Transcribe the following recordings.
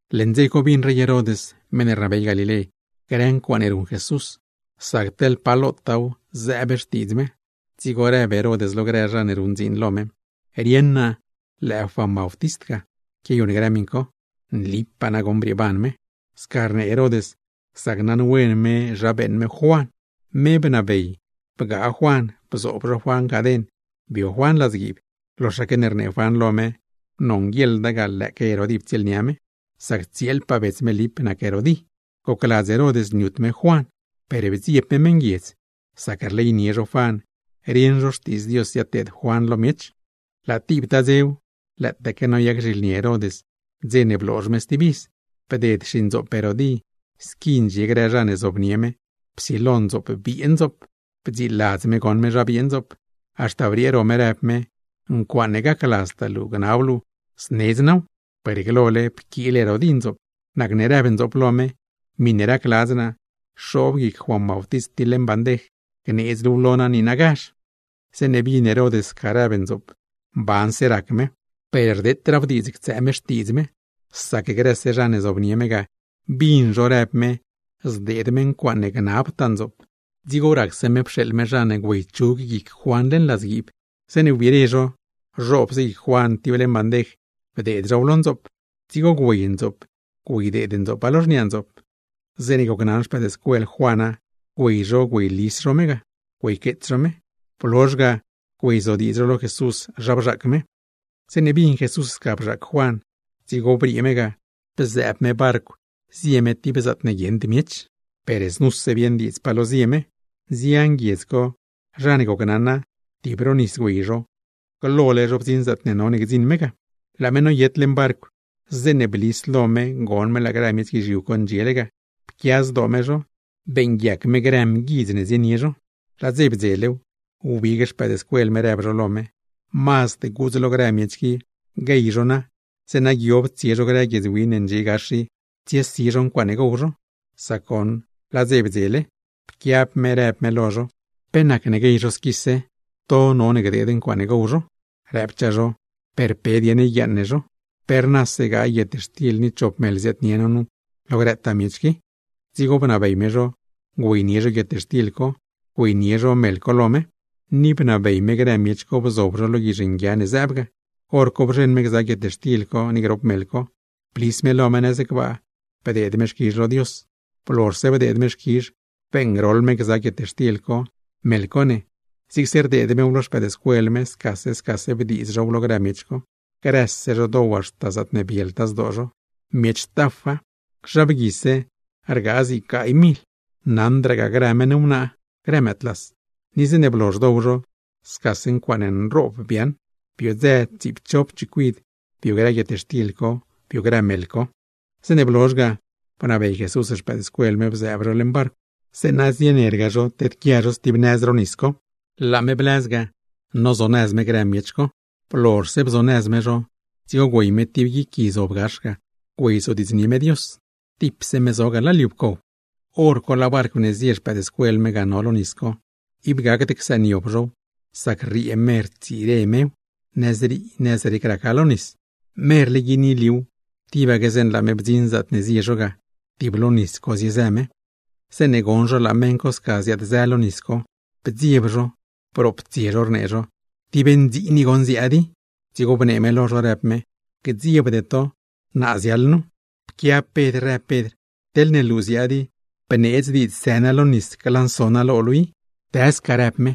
Leṉ dze co bin rey Herod (meṉ ne rnabey Galilé) grë ncuaaṉe ruṉ Jesús, sac teḻ pa lotaaw zëëb xtiidz me; dzigo rëb Herod lo grë zha ne ruṉ dziin lo me: ―Rieṉ naa lëë Juan Bautist ga quiayuṉ grë miṉ co, segur brieeban me. Sca rnee Herod sac naṉwen me zha beeṉ me Juan. Me bnabey bgaa Juan bzoob zho Juan caden bio Juan ladzguiib, loxaque ne rnee Juan lo me nonguieḻda ga lëëque Herodí ptsieelnia me, sac tsieelpaa bets me Lip nac Herodí. Gocladz Herod niut me Juan, per bdzieb me meṉguiedz, sac rleynie zho Juan, rieṉ zho xtiidz Dios ziadteed Juan lo miech. Laa tibtaa dzew, lëëtaque noyac zhilni Herod dze ne bloozh me stib iz, bded tib xindzoop Herodí squi ndxie grë zha ne zobnie me psilo ndzoop biee ndzoop. Bdziladz me goṉ me zha biee ndzoop, haxta briee ro me rëb me: “Ncuaaṉe gacladztaa luu gnab luu, znedz naaw.” Per glole pquiil Herodí ndzoop, nacne rëb ndzoop lo me: “Miṉe racladz naa, xoob guic Juan tib leṉ bandej gneedz luuw lo naa niinagazh.” Zeeṉe bin Herod sca rëb ndzoop, mbanse rac me; per rdeetraaw diidz niab me grieeloda, sac grëse zha ne zobnie me ga, bin zho rëb me zdeed me ncuaaṉe gnabtaa ndzoop. Dzigo racse me pxeeḻ me zha ne güeychug guic Juan leṉ ladzguiib. Zeeṉe wbire zho, zhoobse guic Juan tib leṉ bandej bdeed zhow lo ndzoop, dzigo güey ndzoop güeydeed ndzoopa lo xniaa ndzoop. Zeeṉe gocnaṉ xpëëdscuel Juana, güey zho güeylis zho me ga güeyqueets zho me. Blozh ga güeyzodiidz zho lo Jesús zha bzhaac me. Zeeṉe bin Jesús sca bzhaac Juan, dzigo briee me ga bzëëb me barcw zie me tib zaatne guieṉd miech. Per znuse bieṉ diidza, nzian grë guiedz co zha ne gocnaṉa, tib ro nis güey zho, glole zho bdziṉ zaatne no gdziṉ me ga. Laa me noyet leṉ barcw, zeeṉe blis lo me goṉ me laa grë miech guizhiu co ndxiele ga; pquia zdoo me zho, beeṉguiac me grë mguidz ne zienie zho. Laa dze ziedzelew, wbig xpëëdscuel me rëb zho lo me: ―Mazd gudz lo grë miech qui guey zho na, zeeṉa guiob tsie zho grë guiedz win ne ndxie gax i tsiesi zho ncuaaṉe gow zho; sac goṉ laa dze bdzele. Pquiab me rëb me lo zho: ―¿Pe nacne guey zho squise? To none gdeed ncuaaṉe gow zho. Rëbchaa zho: ―¿Per pe dieṉ yguiaaṉ no zho? Pe rnase gaay guietxtil ni chop meḻ ne ziaadnie no nu, lo grëtaa miech qui. Dzigo bnabey me zho güeynie zho guietxtil co, güeynie zho meḻ co lo me, ni bnabey me grë miech co bzob zho lo grë guizh nguia ne zëëb ga. Horco bzheṉ me gza guietxtil co ni grop meḻ co, blis lo me nëz gbaa, bdeed me xquizh lo Dios. Blozhse bdeed me xquizh, beeṉgroḻ me gza guietxtil co, meḻ co ne, zigse rdeed mew lo xpëëdscuel me scase scase bdiiz zhow lo grë miech co. Grëse zho dow zho haxta zaatne bieltaa zdoo zho. Miech tafa, zha bguise rgaa zig gaay mil, naṉdragaa grë meṉ wnaa, grë mëëdlas; ni zeeṉe blozh dow zho, scase ncuaaṉe nroob biaaṉ, biodzë tsiipchop chicuid bio grë guietxtil co, bio grë meḻ co. Zeeṉe blozh ga, bnabey Jesús xpëëdscuel me bzëëb zho leṉ barcw, zeeṉa zienerga zho tedquia zho stib nëz ro nis co; laa me bii blëz ga, nozonëz me grë miech co. Blozhse bzonëz me zho, dzigo güey me tib guic gui zob gax ga, güeyzodiidznie me Dios, tipse me zo ga laa liu pcow. Horco laa barcw ne zie xpëëdscuel me ga no lo nis co, ib gacd csëëniob zhow, sac rriee me rtsire mew, nëzrii nëzrec raca lo nis. Merle guini liuw, tibaque zeeṉe laa me bdziṉ zaatne zie zho ga, tib lo nis co ziezë me. Zeeṉe goṉ zho laa meṉ co sca ziaad-zë lo nis co, bdzieb zho, broptsie zho rnee zho: ―¡Tib ndziin i goṉ ziaad i! Dzigo bnee me lo zho rëb me: ―¡Gdziebde to, naa ziaḻ nu! Pquiab Pedr rëb Pedr: ―Teḻne luu i ziaad i, bneedz diidz së naa lo nis glanso naa lo luu i. ―¡Dë sca! ―rëb me.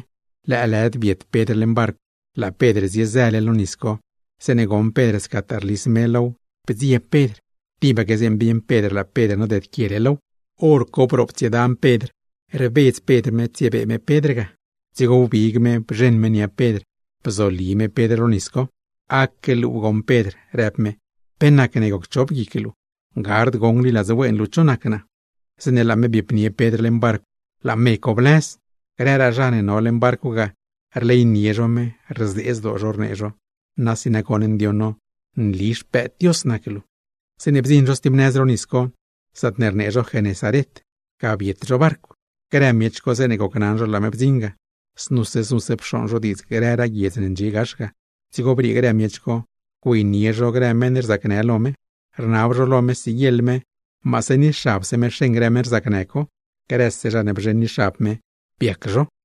Lëëlëd biet Pedr leṉ barcw, laa Pedr ziezële lo nis co zeeṉe goṉ Pedr scataa rlis me low, bdzieb Pedr. Tibaque zeeṉe bieṉ Pedr laa Pedr nodedquiele low, hor co broptsiedan Pedr, rbedz Pedr me, tsiebee me Pedr ga. Dzigo wbig me bzheṉ me nia Pedr, bzoli me Pedr lo nis co. ―¡Aque luu goṉ Pedr! ―rëb me―. ¿Pe nacne gocchop guic luu? ¿Gard goṉ gliladz wen luu cho nac naa? Zeeṉe laa me biepnie Pedr leṉ barcw, laa me co blëz. Grëraa zha ne no leṉ barcw ga, rleynie zho me, rzee zdoo zho rnee zho: ―¡Nasi nagoṉ ndioṉ no nli Xpëëd Dios nac luu! Zeeṉe bdziṉ zho stib nëz ro nis co, zaatne rnee zho Genesaret, ga biet zho barcw. Grë miech co zeeṉe gocnaṉ zho laa me bdziṉ ga, znuse znuse pxooṉ zho diidz grëraa guiedz ne ndxie gax ga. Dzigo briee grë miech co, güeynie zho grë meṉ rzacnë lo me, rnab zho lo me siguieḻ me maase ni xabse me xeṉ grë meṉ rzacnë co. Grëse zha ne bzheṉ ni xab me, biac zho.